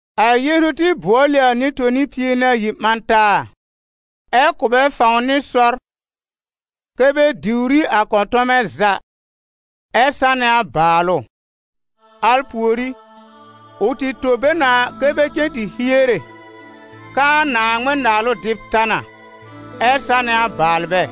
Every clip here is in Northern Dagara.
A Yeezu tɩ bʋɔl ɩ a nɩ-toni pie nɩ ayi ɓã taa, ɛ kʋ̀ bɛ fãw nɩ sɔr kɛ́ bɛ diwr ɩ a kɔ̃tɔmɛ za ɛ sanɛ a bàalʋ. Al pùorí, ʋ tɩ tõ bɛ na kɛ bɛ cen tɩ hiere k'aa Naaŋmɩn-Naalʋ dɩb ta na, ɛ sanɛ a baalbɛ.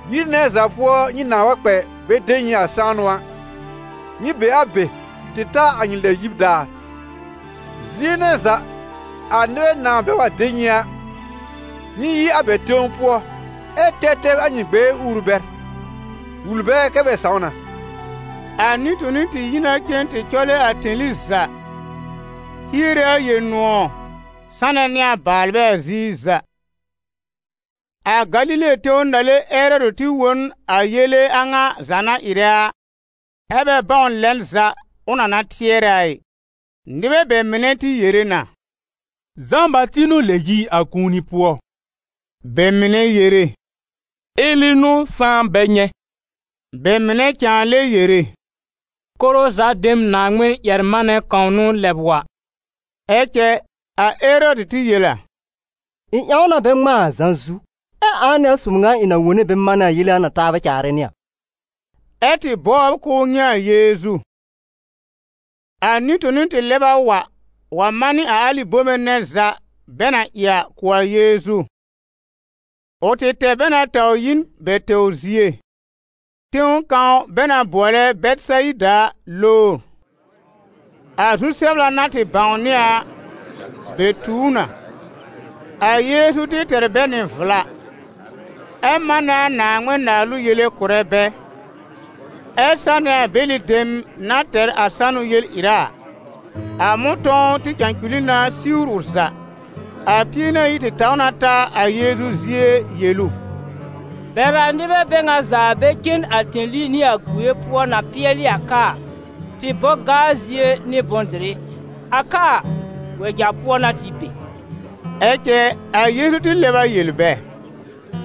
Yir nɛ za pʋɔ nyɩ nãa wa kpɛ bɛ de nyɩ a sãanʋ a, nyɩ be a be tɩ ta a nyɩ lɛb yib daar. Zie nɛ za a nɩbɛ nãa bɛ wa de nyɩ a, nyɩ yi a bɛ tẽw pʋɔ ɛ tɛb tɛb a nyɩ gbɛɛ uuru bɛr, wul bɛ kɛ bɛ sãw na.» A nɩ-toni tɩ yi na cen tɩ cɔlɛ a tẽli za, hiere a Yel-nʋ̃ɔ̀ sanɛ nɩ a baalbɛ a ziir za. A Galile tẽw nàle Erɔdɩ tɩ wõ n a yele a ŋa za na ɩrɛ a, ɛ́ bɛ bãw lɛn za ʋ na na tɩɛrɛ a ɩ. Nɩbɛ bɛ mɩnɛ tɩ yere na: «Zã-Bati n'ʋ lɛb yi a kũuni pʋɔ.» Bɛ mɩnɛ yere: « Eli n'ʋ sãá bɛ nyɛ̃.» Bɛ mɩnɛ cãa lɛ yere: «Koro za dem Naaŋmɩn-ƴɛr-manɛ kãw n'ʋ lɛb wa.» Ɛ cɛ a Erɔdɩ tɩ yel a: «Ɩ̃ ƴãw na bɛ ŋmãa a Zã zu. Ɛ ãa n'ɩ a sob ŋa ɩ̃ na wone bɛ manɛ a yele a ŋa taabɛ caarɛ nɩ a?» Ɛ́ tɩ bɔbr k'ʋʋ nyɛ̃ a Yeezu. A nɩ-toni tɩ lɛb a wa wa manɩ a alɩ bome nɛ za bɛ na ɩ a kʋ̀ a Yeezu. Ʋ tɩ tɛr bɛ na taw yi n bɛ tɛwr zie, tẽw kãw bɛ na bʋɔlɛ Bɛtɩsayida a lowr. A zu-sɛbla na tɩ bãwnɩ a, bɛ tu ʋ na. A Yeezu tɩ tɛr bɛ nɩ vla, ɛ manɛ a Naaŋmɩn-Naalʋ yele kʋ̀rɛ bɛ, ɛ sanɛ a bɛlɩ dem na tɛr a sanʋ yel-ɩra a. A mʋ̃tɔ̃w tɩ cãculi na siwr ʋ za. A Pie-nɩ-ayi tɩ taw na ta a Yeezu zie yel ʋ: «Bɛr a nɩbɛ bɛ ŋa za bɛ cen a tẽli nɩ a gue pʋɔ na pɩɛlɩ a ka a, tɩ bɔ gaa zie nɩ bʋ̃-dɩrɩ, a ka a, wɛja pʋɔ n'a tɩ be.» Ɛ cɛ, a Yeezu tɩ lɛb a yel bɛ: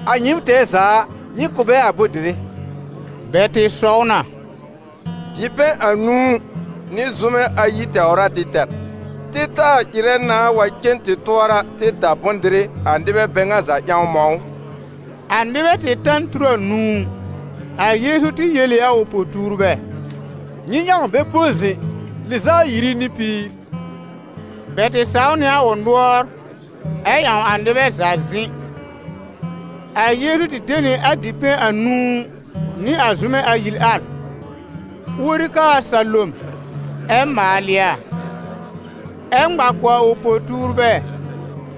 «A nyɩɩm tɛɛ za a, nyɩ kʋ̀ bɛ a bʋ̃-dɩrɩ!» Bɛ tɩ sɔw na: «Dipɛ̃ anũu nɩ zʋ́mɛ ayi tɛwr a tɩ tɛr. Tɩ taa ɩrɛ nãa wa cen tɩ tʋɔra tɩ da bʋ̃-dɩrɩ a nɩbɛ bɛ ŋa za ƴãw mɔ̃ ʋ!» A nɩbɛ tɩ ta n tur anũu. A Yeezu tɩ yel ɩ a ʋ po-tuurbɛ: «Nyɩ ƴãw bɛ põ zɩ̃ lɩz'a ayiri nɩ piir.» Bɛ tɩ saw nɩ a ʋ nʋɔr ɛ ƴãw a nɩbɛ za zɩ̃. A Yeezu tɩ de nɩ a dipɛ̃ anũu nɩ a zʋ́mɛ ayi al, uori kaa a salom, ɛ maalɩ a, ɛ ŋma kʋ̀ a ʋ po-tuurbɛ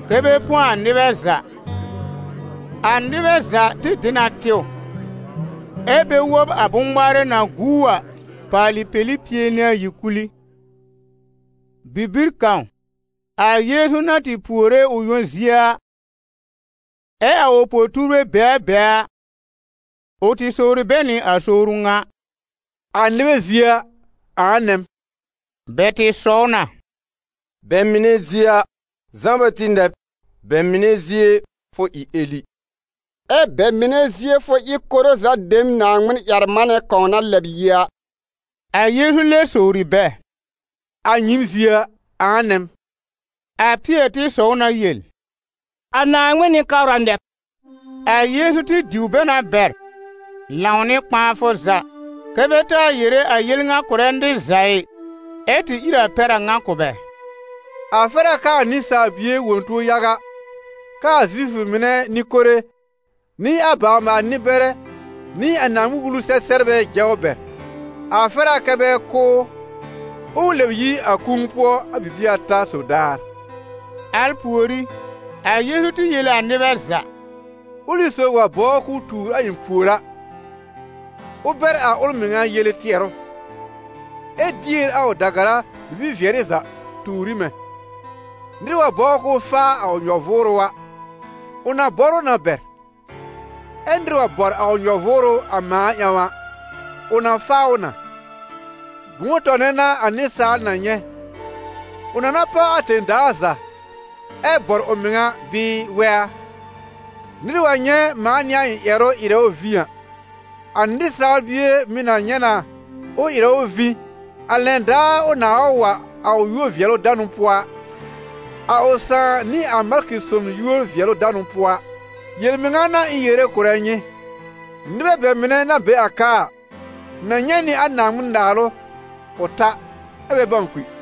kɛ́ bɛ põ a nɩbɛ za. A nɩbɛ za tɩ dɩ na tɩw, ɛ́ bɛ wob a bʋ̃-ŋmaarɛ na guu a paalɩ peli pie nɩ ayi kul ɩ. Bibir kãw, a Yeezu na tɩ puore ʋ yõ zie, ɛ a ʋ po-tuurbɛ be a be a, ʋ tɩ sowri bɛ nɩ a sowru ŋa: «A nɩbɛ zie a, ãa nɛ m?» Bɛ tɩ sɔw na: «Bɛ mɩnɛ zie a, Zã-Bati nɛ b, bɛ mɩnɛ zie fʋ ɩ Eli, ɛ bɛ mɩnɛ zie fʋ ɩ koro za dem Naaŋmɩn-ƴɛr-manɛ kãw na lɛb yi a.» A Yeezu lɛb sowri bɛ: «A nyɩɩm zie a, ãa nɛ m?» A Pɩɛr tɩ sɔw na yel: «A Naaŋmɩn Nɩ-kabra nɛ b.» A Yeezu tɩ diw bɛ na bɛr, lãw nɩ kpãafʋ za, kɛ́ bɛ taa yere a yel ŋa kʋ̀rɛ nɩr za ɩ, ɛ tɩ ír a pɛr a ŋa kʋ̀ bɛ: «A fɛr a kɛ a Nɩsaal Bie wõ tuo yaga, kɛ a Zifʋ mɩnɛ nɩ-kore, nɩ a bawr-maal-nɩ-bɛrɛ nɩ a Naaŋmɩn-Wulu-sɛ-sɛbrbɛ jɛ ʋ bɛr, a fɛr a kɛ bɛ kʋ́ ʋ, ɛ ʋ lɛb yi a kũu pʋɔ a bibie ata sob daar.» Al pùorí, a Yeezu tɩ yel ɩ a nɩbɛ za: «Ʋlɩ sob wa bɔbr k'ʋʋ tuur a ɩ̃ pùor a, ʋ bɛr a ʋl mɩŋa yele tɩɛrʋ, ɛ dier a ʋ da-gara bibi-vɩɛrɩ za tuur ɩ mɛ̃. Nɩr wa bɔbr k'ʋʋ faa a ʋ nyɔ-vʋʋrʋ a, ʋ na bɔr ʋ na bɛr. Ɛ nɩr wa bɔr a ʋ nyɔ-vʋʋrʋ a mãa ƴãw a, ʋ na faa ʋ na. Bʋ̃ʋ tɔnɛ n'a a nɩsaal na nyɛ̃, ʋ na na páw a tẽ-daa za, ɛ bɔr ʋ mɩŋa bɩɩ wɛ a? Nɩr wa nyɛ̃ mãa nɩ a ɩ̃ ƴɛrʋ ɩrɛ ʋ vĩ a, a Nɩsaal Bie mɩ̀ na nyɛ̃ na ʋ ɩrɛ ʋ vĩ, a lɛn daar ʋ nãa wa wa a ʋ yúor-vɩɛlʋ-danʋ pʋɔ a, a ʋ Sãà nɩ a malkɩ son yúor-vɩɛlʋ-danʋ pʋɔ a. Yel-mɩŋa n'a ɩ̃ yere kʋ̀rɛ nyɩ: ‹Nɩbɛ bɛ mɩnɛ na be a ka a, na nyɛ̃ nɩ a Naaŋmɩn-Naalʋ ʋ ta, ɛ́ bɛ bãw kpi.›»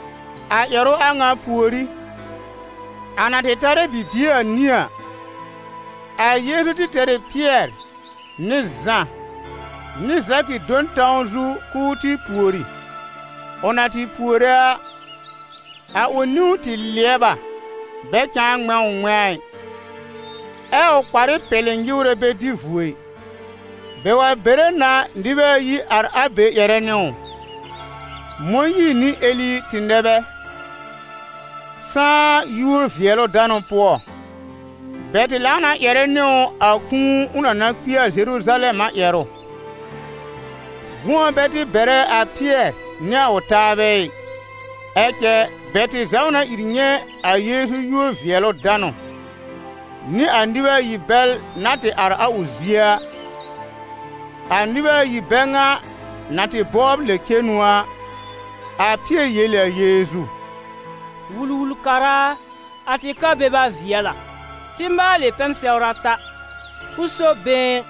A ʋ ƴɛrʋ a ŋa pùorí, a na tɩ tarɛ bibie anĩ a, a Yeezu tɩ tɛr ɩ Pɩɛr nɩ Zã nɩ Zakɩ do n tãw zu k'ʋʋ tɩ pùori. Ʋ na tɩ puore a, a ʋ niwn tɩ lɩɛb a, bɛ cãa ŋmɛ̃ ʋ ŋmɛ̃a a ɩ, ɛ a ʋ kparɩ pɛlɩ nyɩwrɛ bɛ dɩ vuo ɩ. Bɛ wa bere na nɩbɛ ayi ar a be ƴɛrɛ nɩ ʋ: Mõyiir nɩ Eli tɩ nɛ bɛ sãá yúor-vɩɛlʋ-danʋ pʋɔ. Bɛ tɩ lãw na ƴɛrɛ nɩ ʋ a kũu ʋ na na kpi a Zeruzalɛm a ƴɛrʋ. Gʋ̃ɔ bɛ tɩ bɛrɛ a Pɩɛr nɩ a ʋ taabɛ ɩ. Ɛ cɛ bɛ tɩ zaw na ìr nyɛ̃ a Yeezu yúor-vɩɛlʋ-danʋ, nɩ a nɩbɛ ayi bɛl na tɩ ar a ʋ zie a. A nɩbɛ ayi bɛ ŋa na tɩ bɔbr lɛb-cenu a, a Pɩɛr yel ɩ a Yeezu: «Wul-wul-kara a, a tɩ ka beba vɩɛl a, tɩ́ maalɩ pɛn-sɛwr ata: fʋ so been,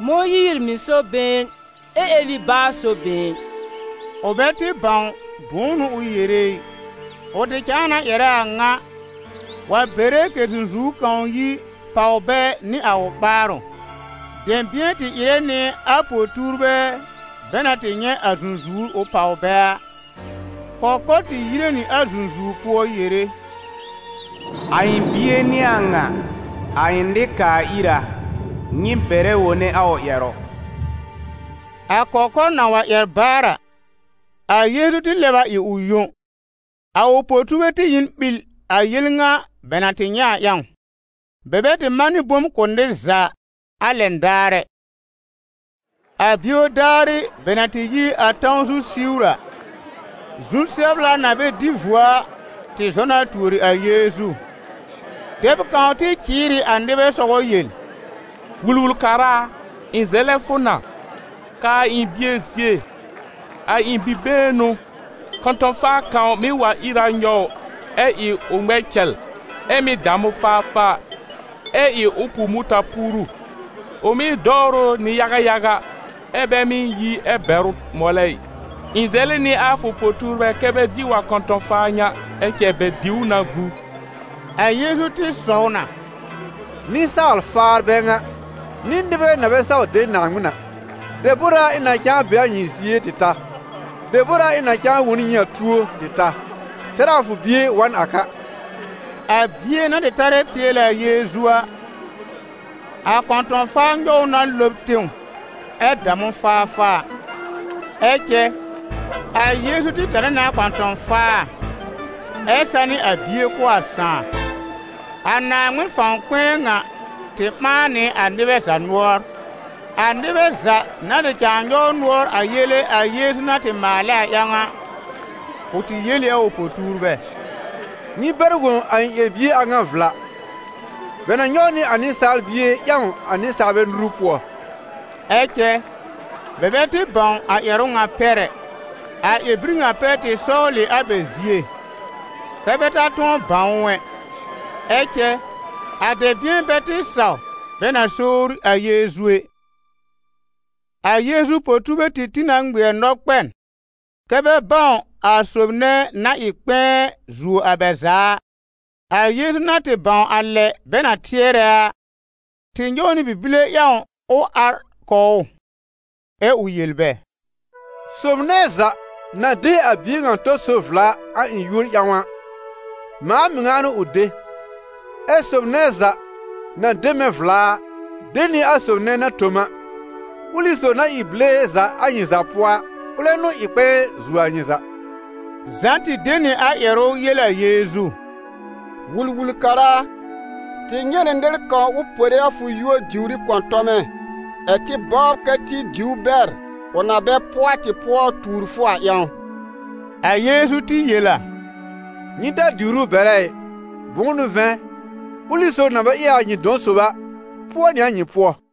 Mõyiir mɩ̀ so been, ɛ Eli baa so been.» Ʋ bɛ tɩ bãw bʋ̃ʋ n'ʋ ʋ yere ɩ. Ʋ tɩ cãa na ƴɛrɛ a ŋa, wa bere kɛ̀ zũzuwr kãw yi pàw bɛ nɩ a ʋ ɓaarʋ. Dɛ̃bɩ̃ɛ tɩ ɩrɛ nɩ a po-tuurbɛ bɛ na tɩ nyɛ̃ a zũzuwr ʋ páw bɛ a. Kɔkɔr tɩ yire nɩ a zũzuwr pʋɔ yere: «A ɩ̃ bie n'ɩ a ŋa, a ɩ̃ nɩ-kaa-ira, nyɩ bɛrɛ wone a ʋ ƴɛrʋ.» A kɔkɔr na wa ƴɛr baar a, a Yeezu tɩ lɛb a ɩ ʋ yõ. A ʋ po-tuurbɛ tɩ ɩ n ɓil a yel ŋa bɛ na tɩ nyɛ̃ a ƴãw, bɛ bɛ tɩ manɩ bom kʋ̀ nɩr za a lɛn daar ɛ. A bio daarɩ bɛ na tɩ yi a tãw zu siwr a, zu-sɛbla na bɛ dɩ vuo a, tɩ zɔ na tuori a Yeezu. Dɛb kãw tɩ cɩɩr ɩ a nɩbɛ sɔgɔ yel: «Wul-wul-kara a, ɩ̃ zɛlɛ fʋ na, kaa a ɩ̃ bie zie, a ɩ̃ bi-been n'ʋ! Kɔ̃tɔ̃-faa kãw mɩ́ wa ìr a nyɔw ʋ, ɛ ɩ ʋ ŋmɛ cɛl, ɛ mɩ́ dam ʋ faafaa, ɛ ɩ ʋ pu mʋta-puuru. Ʋ mɩ́ dɔwr ʋ nɩ yaga yaga, ɛ bɛ mɩ́ yi ɛ bɛr ʋ mɔlɛ ɩ. Ɩ̃ zɛlɩ nɩ a fʋ po-tuurbɛ kɛ́ bɛ diw a kɔ̃tɔ̃-faa ŋa, ɛ cɛ bɛ diw ʋ na gu.» A Yeezu tɩ sɔw na: «Nɩsaal-faar bɛ ŋa, nɩ nɩbɛ na bɛ saw de Naaŋmɩn a! Debor a ɩ̃ na cãa be a nyɩ zie tɩ ta? Debor a, ɩ̃ na cãa wõ n nyɩ a tuo tɩ ta? Tɛr a fʋ bie wa n a ka.» A bie na tɩ tarɛ pɩɛlɛ a Yeezu a, a kɔ̃tɔ̃-faa nyɔw ʋ na lɔb tẽw ɛ dam ʋ faafaa. Ɛ cɛ a Yeezu tɩ tanɩ nɩ a kɔ̃tɔ̃-faa, ɛ sanɩ a bie kʋ̀ a sãà. A Naaŋmɩn fãw kpɛ̃ɛ ŋa tɩ ɓãa nɩ a nɩbɛ za nʋɔr. A nɩbɛ za na tɩ cãa nyɔw nʋɔr a yele a Yeezu na tɩ maalɛ a ƴãw a, ʋ tɩ yel ɩ a ʋ po-tuurbɛ: «Nyɩ bɛr wõ a ɩ̃ ƴɛr-bie a ŋa vla: bɛ na nyɔw nɩ a Nɩsaal Bie ƴãw a nɩsaalbɛ nuru pʋɔ.» Ɛ cɛ bɛ bɛ tɩ bãw a ƴɛrʋ ŋa pɛr ɛ; a ƴɛr-bir ŋa pɛr tɩ sɔwl ɩ a bɛ zie, kɛ́ bɛ ta tʋ̃ɔ bãw ʋ ɛ. Ɛ cɛ a dɛ̃bɩ̃ɛ bɛ tɩ saw bɛ na sowri a Yeezu ɛ. A Yeezu po-tuurbɛ tɩ tĩ na ŋmɩɛr nɔ-kpɛn, kɛ́ bɛ bãw a sob nɛ na ɩ kpɛ̃ɛ zuo a bɛ za a. A Yeezu na tɩ bãw a lɛ bɛ na tɩɛrɛ a, tɩ nyɔw nɩ bi-bile ƴãw ʋ ar kɔw ʋ, ɛ ʋ yel bɛ: «Sob nɛ za na de a bie ŋa tɔ sob vla a ɩ̃ yúor ƴãw a, mãa mɩŋa n'ʋ ʋ de. Ɛ sob nɛ za na de mɛ̃ vla a, de nɩ a sob nɛ na tõ m a; ʋlɩ sob na ɩ bile za a nyɩ za pʋɔ a, ʋlɛ n'ʋ ɩ kpɛ̃ɛ zuo a nyɩ za.» Zã tɩ de nɩ a ƴɛrʋ yel a Yeezu: «Wul-wul-kara a, tɩ nyɛ̃ nɩ nɩr kãw ʋ pore a fʋ yúor diwr ɩ kɔ̃tɔmɛ ɛ̀ tɩ bɔbr kɛ tɩ diw ʋ bɛr, ʋ na bɛ pʋɔ a tɩ pʋɔ tuur fʋ a ƴãw.» A Yeezu tɩ yel a: «Nyɩ ta diwr ʋ bɛrɛ ɩ, bʋ̃ʋ n'ʋ vɛ̃, ʋlɩ sob na bɛ ɩ a nyɩ dɔ̃ sob a, pʋɔ nɩ a nyɩ pʋɔ.»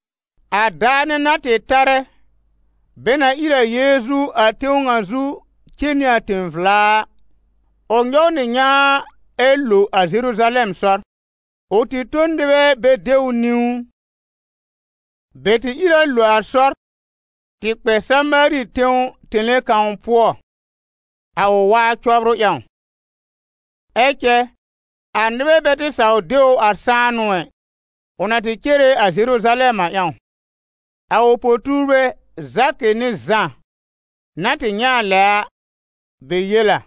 A daar nɛ na tɩ tarɛ bɛ na ír a Yeezu a tẽw ŋa zu cen nɩ a tẽ-vla a, ʋ nyɔw nɩ nyãa ɛ lo a Zeruzalɛm sɔr. Ʋ tɩ tõ n nɩbɛ bɛ de ʋ niwn. Bɛ tɩ ìr a lo a sɔr tɩ kpɛ Samaari tẽw tẽle kãw pʋɔ, a ʋ waa cɔbrʋ ƴãw. Ɛ cɛ a nɩbɛ bɛ tɩ saw de ʋ a sãanʋ ɛ, ʋ na tɩ cere a Zeruzalɛm a ƴãw. A ʋ po-tuurbɛ Zakɩ nɩ Zã na tɩ nyɛ̃ a lɛ a, bɛ yel a: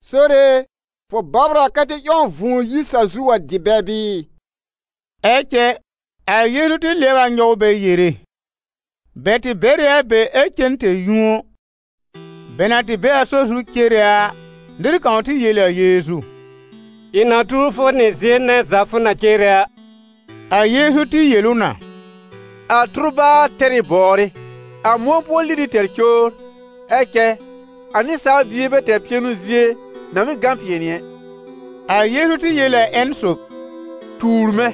«Sore e, fʋ bɔbr a kɛ tɩ ƴãw vũu yi sa-zu wa dɩ bɛ bɩɩ?» Ɛ cɛ a Yeezu tɩ lɩɛb a nyɔw bɛ yere. Bɛ tɩ bɛr ɩ a be ɛ cen tẽ-yũo. Bɛ na tɩ be a sɔr zu cere a, nɩr kãw tɩ yel ɩ a Yeezu: «Ɩ̃ na tuur fʋ nɩ zie nɛ za fʋ na cere a.» A Yeezu tɩ yel ʋ na: «A tʋrbaar tɛr ɩ bɔwrɩ, a mʋ̃ɔ pʋɔ lili tɛr cowr, ɛ cɛ a Nɩsaal Bie bɛ tɛr pɩɛnʋ zie na mɩ́ gã pɩɛnɩ ɛ.» A Yeezu tɩ yel ɩ a ƴẽn sob: «Tuur mɛ̃.»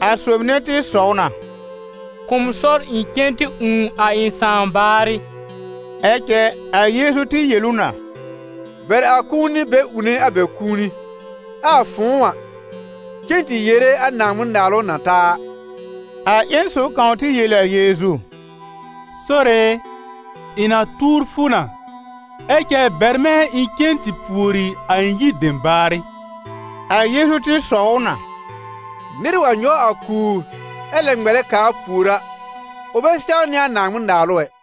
A sob nɛ tɩ sɔw na: «Kʋ̀ m sɔr ɩ̃ cen tɩ ũù a ɩ̃ sãà baarɩ.» Ɛ cɛ a Yeezu tɩ yel ʋ na: «Bɛr a kũuni bɛ ũune a bɛ kũuni, ɛ a fʋ̃ʋ a, cen tɩ yere a Naaŋmɩn-Naalʋ na ta a.» A ƴẽn sob kãw tɩ yel ɩ a Yeezu: «Sore e, ɩ̃ na tuur fʋ na, ɛ cɛ bɛr mɛ̃ ɩ̃ cen tɩ pùori a ɩ̃ yir dem baarɩ.» A Yeezu tɩ sɔw ʋ na: «Nɩr wa nyɔw a kùur ɛ lɛ ŋmɛlɛ kaar pùor a, ʋ bɛ sɛwnɩ a Naaŋmɩn-Naalʋ ɛ.»